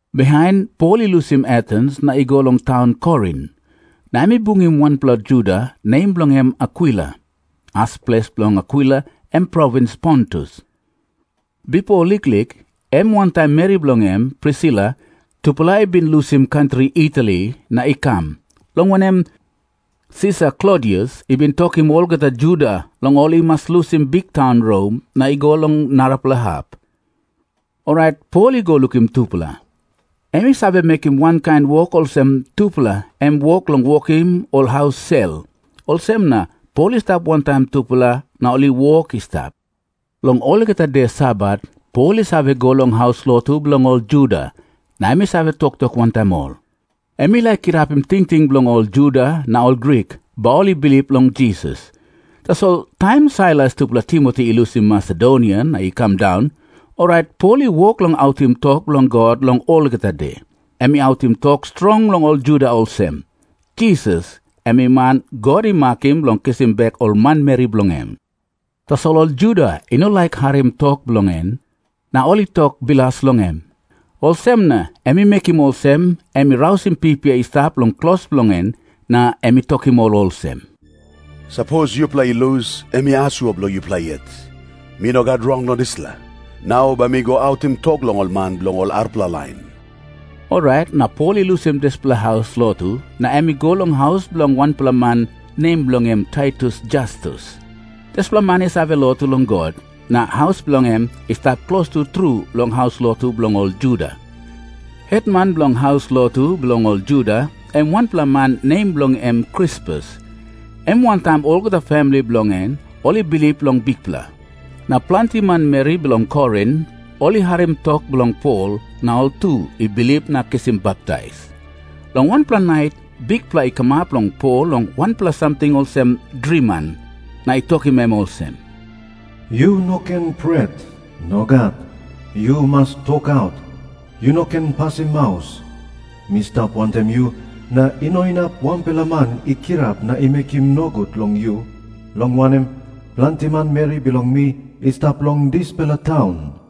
Bihain Pol i lusim Atens na i go long taun Korin, na em i bungim wanpela Juda, nem bilong en Akwila. As ples bilong Akwila em provins Pontus. Bipo liklik, em wantaim meri bilong en, Prisila, tupela i bin lusim kantri Itali na i kam, long wanem, Sisar Klodius i bin tokim olgeta Juda long ol i mas lusim biktaun Rom na i go long narapela hap. Orait Pol i go lukim tupela. Em i save mekim wankain wok olsem tupela, em wok bilong wokim ol haus sel. Olsem na Pol i stap wantaim tupela, na ol i wok i stap. Long olgeta de Sabat Pol i save go long haus lotu bilong ol Juda na em i save toktok wantaim ol. Em i laik kirapim tingting bilong ol Juda na ol Grik bai ol i bilip long Jisas. Tasol taim Sailas tupela Timoti i lusim Masedonia na i kam daun, orait Pol i wok long autim tok bilong God long olgeta de. Em i autim tok strong long ol Juda olsem, "Jisas em i man God i makim bilong kisim bek ol manmeri bilong en." Tasol ol Juda i no laik harim tok bilong en, na ol i tok bilas long em. Olsem na em i mekim olsem em i rausim pipia i stap long klos bilong en, na em i tokim ol olsem, "Sapos yupela i lus, em i asua bilong yupela yet. Mi no gat rong long dispela. Nau bai mi go autim tok long ol man bilong ol arapela lain." Orait na Pol i lusim dispela haus lotu, na em i go long haus bilong wanpela man, nem bilong en Titius Jastus. Dispela man i save lotu long God, na haus bilong en i stap klostu tru long haus lotu bilong ol Juda. Hetman bilong haus lotu bilong ol Juda, em wanpela man nem bilong en Krispus. Em wantaim olgeta famili bilong en, ol i bilip long Bikpela. Na planti manmeri bilong Korin ol i harim tok bilong Pol, na ol tu i bilip na kisim baptais. Long wanpela nait Bikpela i kamap long Pol long wanpela samting olsem driman, na i tokim em olsem, "Yu no ken pret. Nogat. Yu mas tokaut. Yu no ken pasim maus. Mi stap wantaim yu, na i no inap wanpela man i kirap na i mekim nogut long yu, long wanem, planti manmeri bilong mi i stap long dispela taun."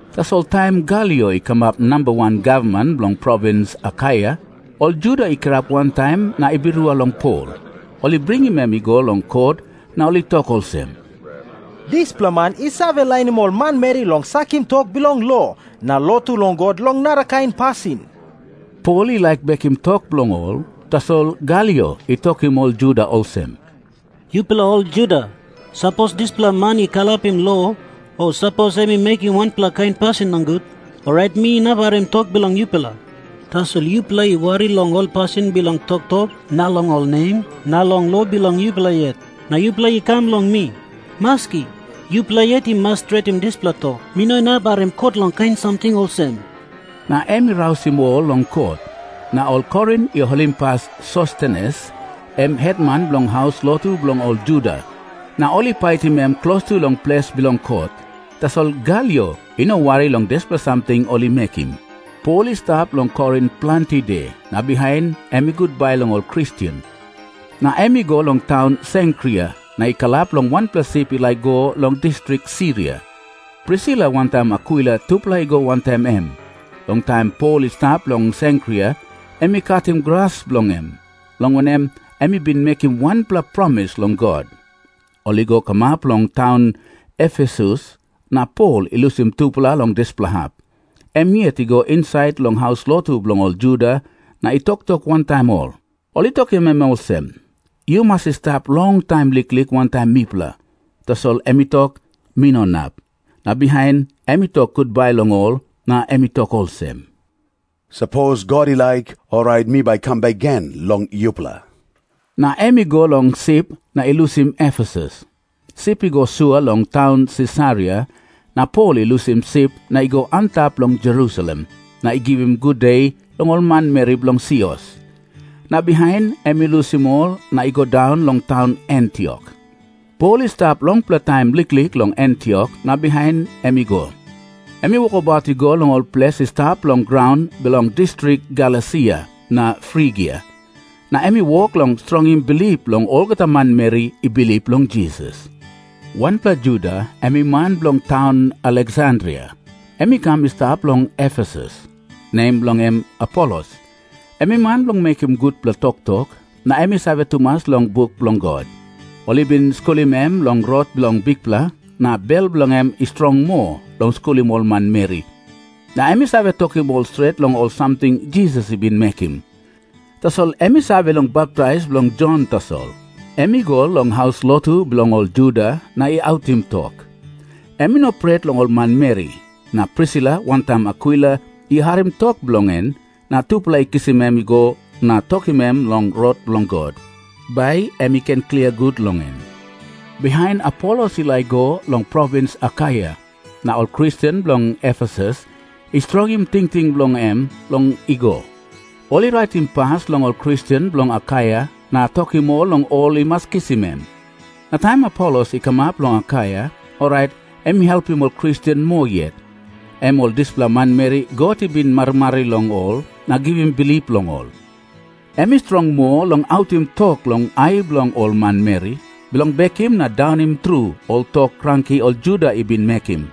Tasol taim Galio i kamap namba wan gavman bilong provins Akaia, ol Juda i kirap wantaim na i birua long Pol. Ol i bringim em i go long kot, na ol i tok olsem, "Dispela man i save lainim ol manmeri long sakim tok bilong lo na mekim lotu long God long narakain pasin." Pol i laik bekim tok bilong ol, tasol Galio i tokim ol Juda olsem, "Yupela ol Juda, sapos dispela man i kalapim lo o sapos em i mekim wanpela kain pasin nogut, orait mi inap harim tok bilong yupela. Tasol yupela i wari long ol pasin bilong toktok na long ol nem na long lo bilong yupela yet, na yupela i kam long mi. Maski, yupela yet i mas stretim dispela tok. Mi no inap harim kot long kain samting olsem." Na em i rausim ol long kot. Na ol Korin i holimpas Sostenes, em hetman bilong haus lotu bilong ol Juda, na ol I paitim em klostu long ples bilong kot. Tasol Galio i no wari long dispela samting ol i mekim. Pol i stap long Korin planti de, na bihain em i gutbai long ol Kristen. Na em i go long taun Senkria na i kalap long wanpela sip i laik i go long distrik Siria. Prisila wantaim Akwila tupela i go wantaim em. Long taim Pol i stap long Senkria em i katim gras bilong en, long wanem, em i bin mekim wanpela promis long God. Ol i go kamap long taun Efesus, na Pol i lusim tupela long dispela hap. Em yet i go insait long haus lotu bilong ol Juda na i toktok wantaim ol. Ol i tokim em olsem, "Yu mas i stap longtaim liklik wantaim mipela." Tasol em i tok, "Mi no inap." Na bihain em i tok gutbai long ol, na em i tok olsem, "Sapos God i laik, orait mi bai kam bek gen long yupela." Na em i go long sip na i lusim Efesus. Sip i go sua long taun Sisaria, na Pol i lusim sip na i go antap long Jerusalem na i givim gude long ol manmeri bilong sios. Na bihain em i lusim ol na i go daun long taun Antiok. Pol i stap longpela taim liklik long Antiok na bihain em i go. Em i wokabaut i go long ol ples i stap long graun bilong distrik Galesia na Frigia, na em i wok long strongim bilip bilong olgeta manmeri i bilip long Jisas. Wanpela Juda, em i man bilong taun Aleksandria, em i kam i stap long Efesus. Nem bilong en Apolos. Em i man bilong mekim gutpela toktok, na em i save tumas long buk bilong God. Ol i bin skulim em long Rot bilong Bikpela, na bel bilong en i strong moa long skulim ol manmeri, na em i save tokim ol stret long ol samting Jisas i bin mekim. Tasol em i save long baptais bilong Jon tasol. Em i go long haus lotu bilong ol Juda na i autim tok. Em i no pret long ol manmeri. Na Prisila wantaim Akwila i harim tok bilong en, na tupela i kisim em i go na tokim em long Rot bilong God, bai em i ken klia gut long en. Bihain Apolos i laik i go long provins Akaia, na ol Kristen bilong Efesus i strongim tingting bilong em long i go. Ol i raitim pas long ol Kristen bilong Akaia na tokim ol long ol i mas kisim em. Na taim Apolos i kamap long Akaia, orait em i helpim ol Kristen moa yet, em ol dispela manmeri God i bin marimari long ol na givim bilip long ol. Em i strong moa long autim tok long ai bilong ol manmeri, bilong bekim na daunim tru ol tok kranki ol Juda i bin mekim.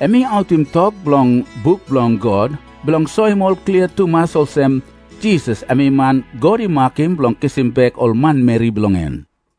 Em i autim tok bilong buk bilong God bilong soim ol klia tumas olsem, Jisas em i man God i makim bilong kisim bek ol manmeri bilong en.